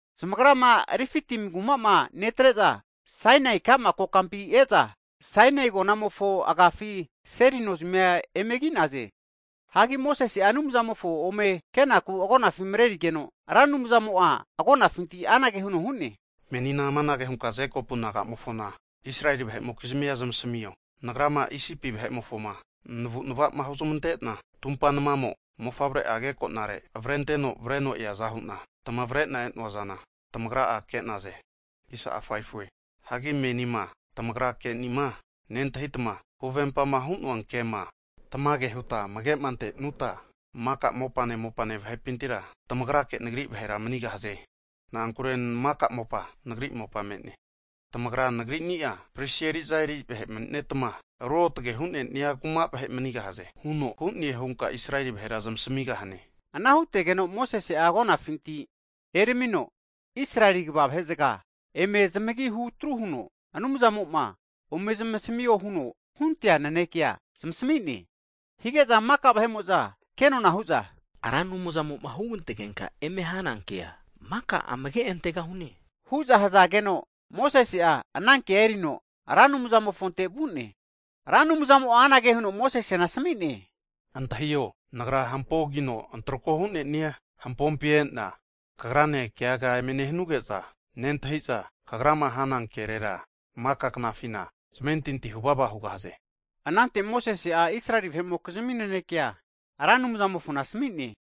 Zamagrama Refitimi kuma'ma netre'za Sainai ka'ma kokampi e'za Sainai agonamofo agafi seli nozamia emegi'naze. Hagi Mosese'a Anumzamofo ome kenaku agonafi mrerigeno, Ra Anumzamo'a agonafinti anage huno hu'ne, Menina amanage hunka Jekopu nagamofona Israeli vahe'mokizmia zamasamio, Nagrama Isipi vahe'mofoma navu'nava'ma hunezmante'na tumpa namamo mofavre'a agekonare avrenteno avreno eaza hu'na, tamavre'na e'noazana tamagra'a ke'naze. Hagi menima tamagra ke'nima nentahitma, huvempama hu'noake'ma tamage hutma amage'ma ante'nuta, maka mopane mopane vahepintira tamagrake Nagri vahera manigahaze. Na'ankure maka mopa Nagri mopa me'ne. Tamagra Nagrini'a pristi eri'za eri vahe mani'netma, ruotage hu'neni'a kuma vahe manigahaze huno hu'ne hunka Israeli vahera zmasamigahane. Ana hutegeno Mosese'a agonafinti eramino, Israeli kva vahe'zaga eme zamagihu atru huno, Anumzamo'ma ome zamasamio huno hunte'nea nanekea zamasami'ne. Hige'za maka vahe'mo'za kenona hu'za, Ra Anumzamo'ma hugantegenka eme hana kea maka amage antegahune hu'za hazageno, Mosese'a anankea erino Ra Anumzamofonte vu'ne. Ra Anumzamo'a anage huno Mosesena asmi'ne, Antahio, Nagra hampogino antrako hu'ne'nia hampompi e'na kagranena keaga eme nehanuge'za, nentahi'za kagrama hana kerera maka knafina zamentintia huvava hugahaze. Anante Mosese'a Israeli vahe'mokizmi nanekea Ra Anumzamofona asami'ne.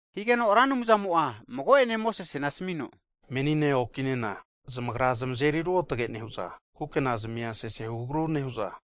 Higeno Ra Anumzamo'a mago'ene Mosesena asamino, Menine okinena zamagra zamazeri ruotage nehu'za, kukena zimia sesehu agru nehu'za,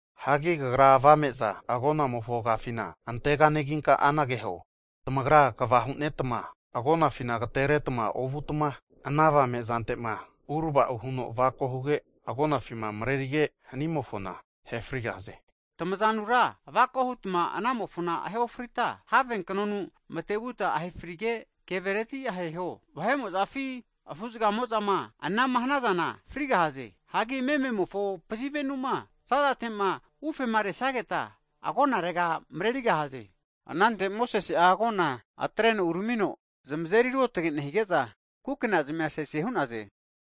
Hagi kagra avame'za agonamofo agafina anteganeginka anage huo, tamagra kva hu'netma agonafina agatereta ovutma, ana avame'zantema uravao huno avako huge, agonafima mrerige'ma hanimofona ahe frigahaze. Tamazanura avako hutma anamofona ahe ofrita, have knonu matevutma ahefrige, kevereti aheho. Vahe'mozafi afu'zagamo'zama anama hanazana frigahaze. Hagi mememofo pazivenu'ma za'zate'ma ufemaresageta, agonarega mrerigahaze. Anante Mosese'a agona atreno uramino zamazeri ruotage nehige'za, kukena zamia sese hu'naze.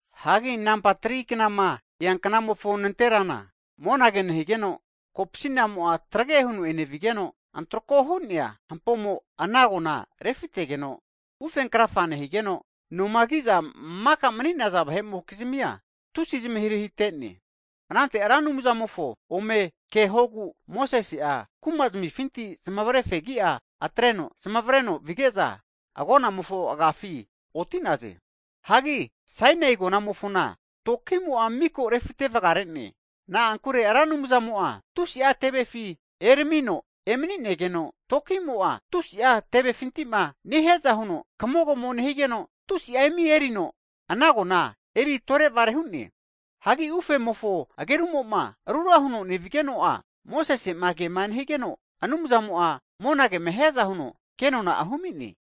Hagi nampa 3knama eanknamofo nanterana, monage nehigeno kopsinamo'a trage huno enevigeno, antrako hu'nea hampomo ana agona refitegeno, ufenkrafa nehigeno, nomaki'za maka mani'naza vahe'mokizmia tusi'a zmahirahitene. Anante Ra Anumzamofo ome kehogu Mosese'a kumazmifinti zmavare fegi'a atreno zamavreno vige'za, agonamofo agiafi oti'naze. Hagi Sainai agonamofona toki'mo'a miko refitevagare'ne. Na'ankure Ra Anumzamo'a tusi'a tevefi eramino emani'negeno, tuki'mo'a tusi'a tevefinti'ma nehiaza huno kamogamo nehigeno, tusi'a imi erino ana agona eri tore'vare hu'ne. Hanki ufemofo agerumo'ma rura huno nevigeno'a, Mosese'ma kema nehigeno, Anumzamo'a monagema hiaza huno kenona'a humi'ne.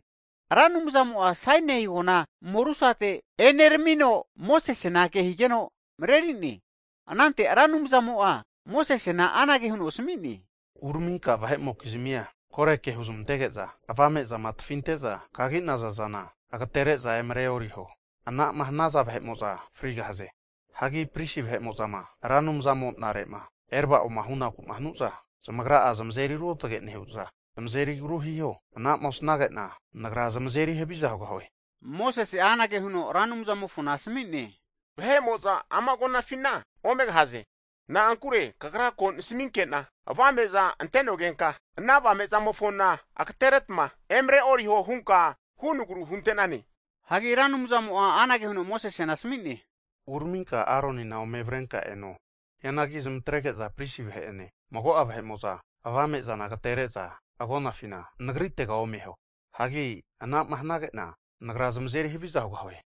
Ra Anumzamo'a Sainai agona morusate eneramino, Mosesena ke higeno mareri'ne. Anantera Ra Anumzamo'a Mosesena anage huno asami'ne, uraminka vahe'mokizmia kore ke huzmantege'za, avame'zama tafinte'za kagi'naza zana agatere'za emreoriho. Anama hanaza vahe'mo'za frigahaze. Hagi pristi vahe'mo'zama Ra Anumzamo'nare'ma erava'oma hunaku'ma hanu'za, zamagra'a zamazeri ruotage nehu'za zamazeri agru hiho. Ana'ma osnage'na Nagra zamazeri haviza hugahie. Mosese'a anage huno Ra Anumzamofona asami'ne, vahe'mo'za ama agonafina omegahaze. Na'ankure Kagra ko nasaminke'na avame'za ante'nogenka ana avame'zamofona agateretma emreoriho hunka hunagru hunte'nane. Hagi Ra Anumzamo'a anage huno Mosesena asami'ne, Uraminka Aronina ome avrenka eno. Hianagi zmatrege'za pristi vahe'ene, mago'a vahe'mo'za avame'zana agatere'za agonafina Nagritega omeho. Hagi anama hanage'na, Nagra zamazeri haviza hugahue.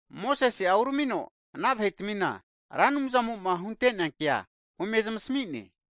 Mosese'a uramino ana vahetamina, Ra Anumzamo'ma huntea kea ome zamsami'ne.